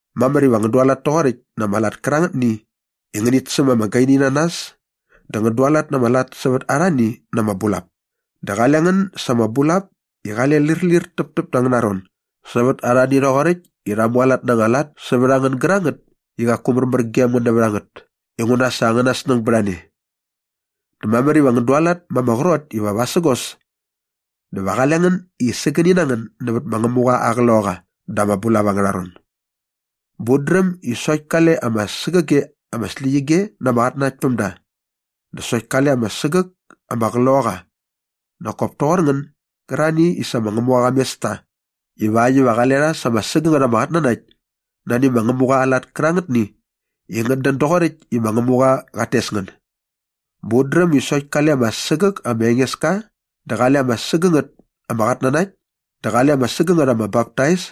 Mamär iva ngän dualat toqoräkt na ama lat kärangätni i ngänit säm ama gaini na nas dä ngän dualat na ama lat sävät arhani na ama bulap dä qale ngän sa ama bulap i qale lärlir täptäp da angäna ron sävät arhani rhoqoräkt i rha mualat na anga lat sävät a ngän gärangät i qaku märmär gem ngän nävät a ngät inguna sa angäna snäng bät a ne. Dä mamär iva ngän dualat ma ama qrot iva vasägos dä va qale ngän i sägäni na ngän nävät ma Ngämuqa aa Qloqaqa da ama bulap angärha ron. Bä ut dräm i sokt kale ama sägäge ama släqyige na ama qatnanaktpämda dä sokt kale ama sägäk ama Qloqaqa nak kop toqor ngän gärarhani i sa ma Ngämuqa qa mes ta ivakt iva qale rha sa ama sägängät ama qatnanakt nani ma Ngämuqa aa lat kärangätni i ngät dän doqoräkt i ma Ngämuqa qat tes ngän. Bä ut dräm i sokt kale ama sägäk ma Engeska dä qale ama sägängät ama qatnanakt dä qale ama sägängät ama baptais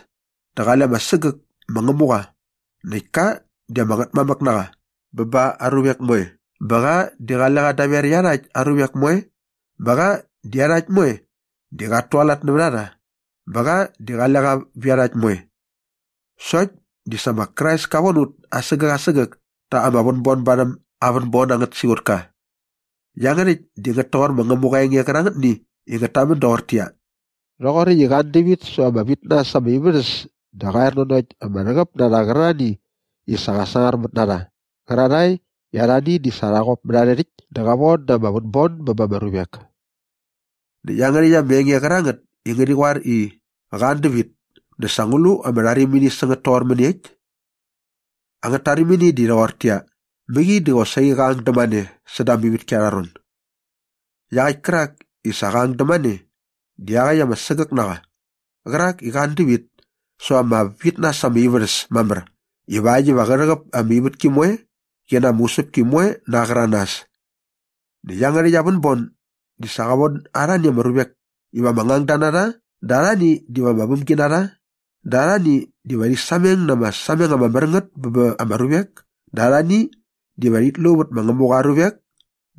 dä qale ama sägäk ma Ngämuqa näkt ka di ama Ngätmamäk na qa bä ba aa ruvek moe bä qa di qale qa daver iarhakt aa ruvek moe bä qa di iarhakt moe di qat tualat nävät a rha bä qa di qale qa vä iarhakt moe. Sokt di sa ma Krais ka von ut asägäk asägäk ta ama vänbon barhäm aa vänbon angät siqutka. Iangärhäkt di ngät toqor ma Ngämuqa aa enge qärangätni i ngät tamän doqortäqyia, “Rhoqoräkt i qa an dävit säva ama vit na äs ama ivärhäs dä qa er nanokt ama rhäqäp na rha qärarhani i sa qa sangarmät na rha qärarhae i arhani di sa rha qop mät arhä rhäkt dä qa von da ama vänbon bä ba ama ruvek.” Näkt iangärhäkt ama enge qärangät i ngärhi qoar i, “Qa an dävit” dä sa ngu lu ama rharimini sä ngät toqor mäniekt? Angät tarimini di rhoqortäqyia, mäqi di qosaqi qa ang dämane säda ama ivätki arha ron. Iaqäkt kärak i sa qa ang dämane di iaqäkt ama sägäk na qa qärak i qa an dävit säva ama vit na äs ama ivärhäs mamär ivakt iva qä rhäqäp ama ivätki moe qi na ama usäpki moe na aa qäranas. Näkt iangärhäkt aa vänbon di sa qa von arhani ama ruvek iva ama ngangda na rha dä arhani diva ama vämginarha na rha dä arhani diva rhi sameng na ama sameng ama mär ngät bä ba ama ruvek dä arhani diva rhit lu vät ma Ngämuqa aa ruvek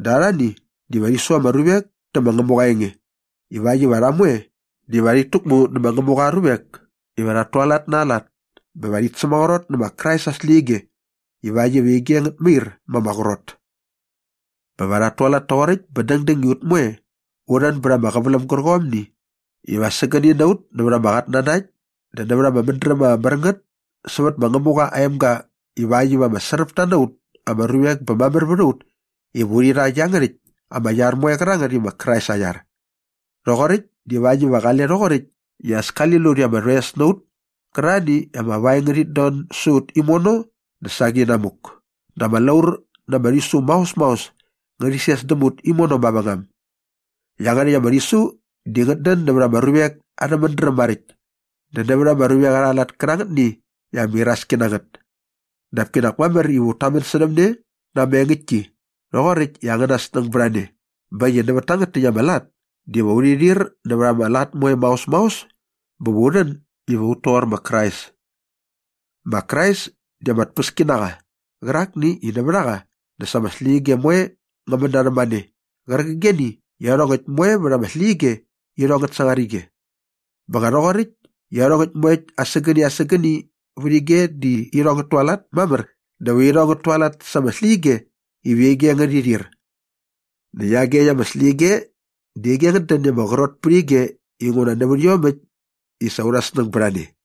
dä arhani diva rhi su ama ruvek tä ma Ngämuqa aa enge ivakt iva rha moe diva rhit täkmu nä ma Ngämuqa aa ruvek iva rhat tualat na aa lat bä va rhit sämaqrot nä ma Krais aa släqyige ivakt iva ige ngät mair ma ama qrot. Bä va rhat tualat toqoräkt bä dängdäng i ut moe u rhän bät ama qäväläm gärqomni iva sägäni na ut nävät ama qatnanakt dä nävät ama mädräm ama mär ngät sävät ma Ngämuqa aa emga ivakt iva ama sräpta na ut ama ruvek bä mamär vät a ut iva urhi rha iangärhäkt ama iar moe qärangät i ma Krais aa iar. Rhoqoräkt divakt iva qale rhoqoräkt i as kali lut i ama rhoes na ut kärarhani i ama vaeng ngärhit don sä ut imono dä saqi inamuk dä ama laur na ama rhisu maos maos ngärhi ses däm ut imono mavängam. Iangärhäkt ama rhisu di ngät dän nävät ama ruvek arhä mädräm maräkt dä nävät ama ruvek arha lat kärangätni i ama iraski na ngät. Dap kinak mamär iva ut tamän särhäm ne na ama engäktki rhoqoräkt i angäna snäng bät a ne bä äkt i nävät tangät täkt ama lat diva urhi rhir nävät ama lat moe maos maos bä va u rhän iva ut toqor ma Krais. Ma Krais di ama tpäski na qa qärakni i nävät a qa dä sa ama släqyige moe ngä män na rhämane qärqigeni i iarhongäkt moe vät ama släqyige irhong ngät sangar ige. Bä nga rhoqoräkt i iarhongäkt moekt asägäni asägäni vät ige di irhong ngät tualat mamär diva irhong ngät tualat sa ama släqyige iva ige ngärhi rhir. Näkt iagekt ama släqyige di ige ngät dän i ama qrot pät ige inguna nävät iomäkt i sa aurha snäng bät a ne.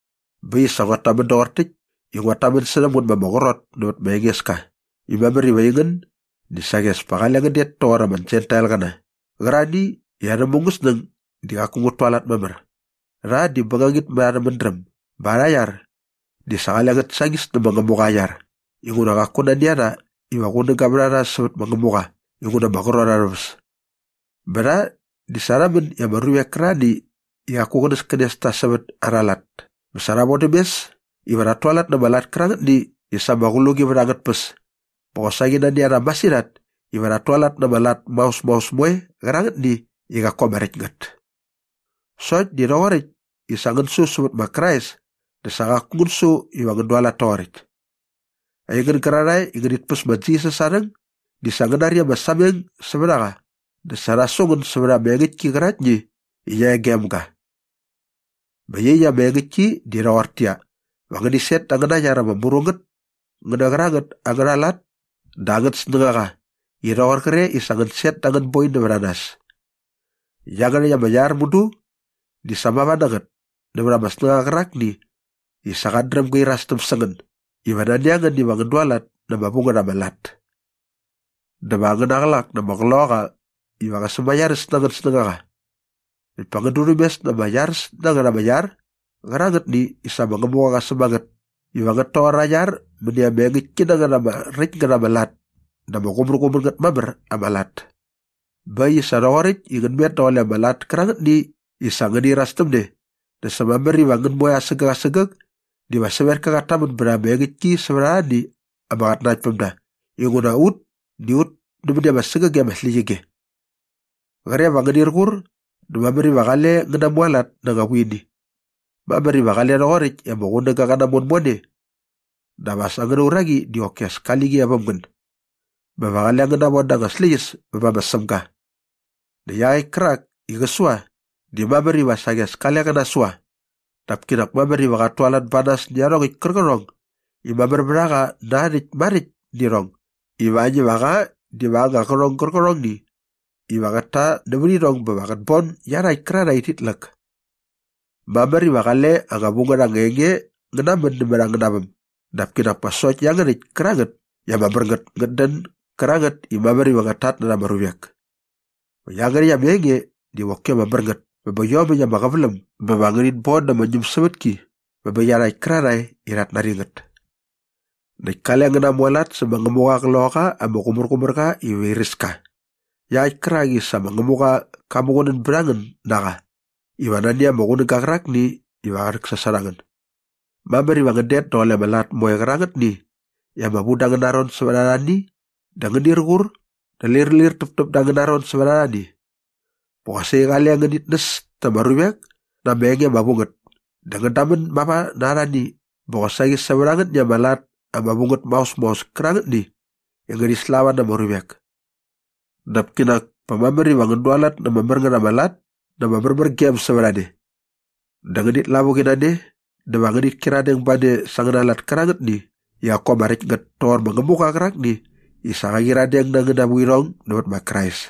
Bä äkt i sa nguat tamän doqor täkt i nguat tamän särhäm ngän ma ama qrot nävät ma Engeska i mamär iva aingän di saqi as pa qale ngän det toqor ama Jentailqäna qärarhani i arhä mungäsnäng di qaku ngät tualat mamär. Rha di bängangit mät arhä mädräm bä arha iar di sa qale ngät sañis nä ma Ngämuqa aa iar inguna qaku nani a rha iva qunäga vät a rha sävät ma Ngämuqa inguna ama qrot arhä väs. Bä rha di sa rha män i ama ruvek kärarhani i qaku qänäskänes ta sävät arha lat bä sa rha vodäm mes iva rhat tualat na ama lat kärangätni i sa ama qluqi vät angät tpäs bä qosaqi nani a rha masirhat iva rhat tualat na ama lat maos maos moe kärangätni i qaku ama räkt ngät. Sokt di rhoqoräkt i sa ngän su sävät ma Krais dä sa qaku ngän su iva ngän dualat toqoräkt. Aingän gärarhae i rhit päs ma Jisas aa rhäng di sa ngän nari ama sameng sävät a qa dä sa rha su ngän sävät ama engäktki qäraktni i qia e gem ga. Bä iaqyäkt ama engäktki di rhoqortäqyia, va ngäni set da angäna iar ama mru ngät ngä nä qärangät angärha lat dä angät snängaqa i rhoqor qre i sa ngän set da anga boi nävät a nas. Iangärhäkt ama iar mudu di sa mava na ngät nävät ama snängaqa qärakni i sa qat dräm gä irastäm sä ngän iva nani a ngän iva ngän dualat na ama vu ngät ama lat. Dä va angäna qlak na ama Qloqaqa iva qä sämaiaräs na angän snängaqa. Näkt pa ngän durhämes na ama iaräs na ngät ama iar qärangätni i sa ma Ngämuqa qa säm a ngät iva ngät toqor aa iar mäni ama engäktki na ngät ama räkt ngät ama lat dä ama qumärqumär ngät mamär ama lat. Bä äkt i sa rhoqoräkt i ngän met daqule ama lat kärangätni i sa ngäni iras täm ne dä sa mamär iva ngän moe asägäk asägäk diva sävetka qat tamän bät ama engäktki sävät arhani ama qatnanaktpämda inguna ut di ut nämäni ama sägäge ama släqyige. Qre va ngänir qur dä mamär iva qale ngän namualat na anga vuini. Mamär iva qale rhoqoräkt i ama qunäga qä namon mone dap as angäna uraqi di qoki as kia e väm ngän bä va qale ngän navon da anga släqyäs bä bä ma Sämga. Näkt iaqäkt kärak i qä sua di mamär iva saqi as kale qä nasua dap kinak mamär iva qat tualat ba nas nä iarhongäkt kärqärhong i mamär vät a qa na aa rhäkt maräkt nä irhong ivakt iva qa diva aa anga qärhong gärqärhongni iva qät ta nävät irhong bä va qät bon iarhakt kärarhae i rhit läk. Mamär iva qale anga vu ngät anga enge ngä namän nämät angäna väm dap kinak pa sokt iangärhäkt kärangät i ama mär ngät ngät dän gärangät i mamär iva ngät tatnärha ama ruvek. Va iangärhäkt ama enge diva qoki ama mär ngät bä bä iomäkt ama qäväläm bä va ngärhit bon da ama ñämsävätki bä bä iarhakt kärarhae i rhat nari ngät. Näkt kale ngän namualat sä ma Ngämuqa aa Qloqaqa ama Qumärqumärqa iva airäs ka iaqäkt kärak i sa ma Ngämuqa qa muqunän bät a ngän na qa iva nani ama qunäga qärakni iva qä rhäksasot a ngän. Mamär iva ngän det daqule ama lat moe qärangätni i ama vu da angäna ron sävät arhani dä ngänir qur dä lärlir täptäp da angäna ron sävät arhani. Bä qosaqi qale ngänit näs ta ama ruvek na ama enge ama vu ngät dä ngän damän mava na arhani bä qosaqi sävät angätni ama lat ama vu ngät maos maos kärangätni i ngärhi slava na ama ruvek. Dap kinak pa mamär iva ngän dualat na ama mär ngät ama lat na ama märmärgem sävät a ne. Dä ngänit lavuqi na ne dä va ngänit kyiradeng ba ne sa angäna lat kärangätni i qaku ama räkt ngät toqor ma Ngämuqa qärakni i sa qa qyiradeng na angäna vuirhong nävät ma Krais.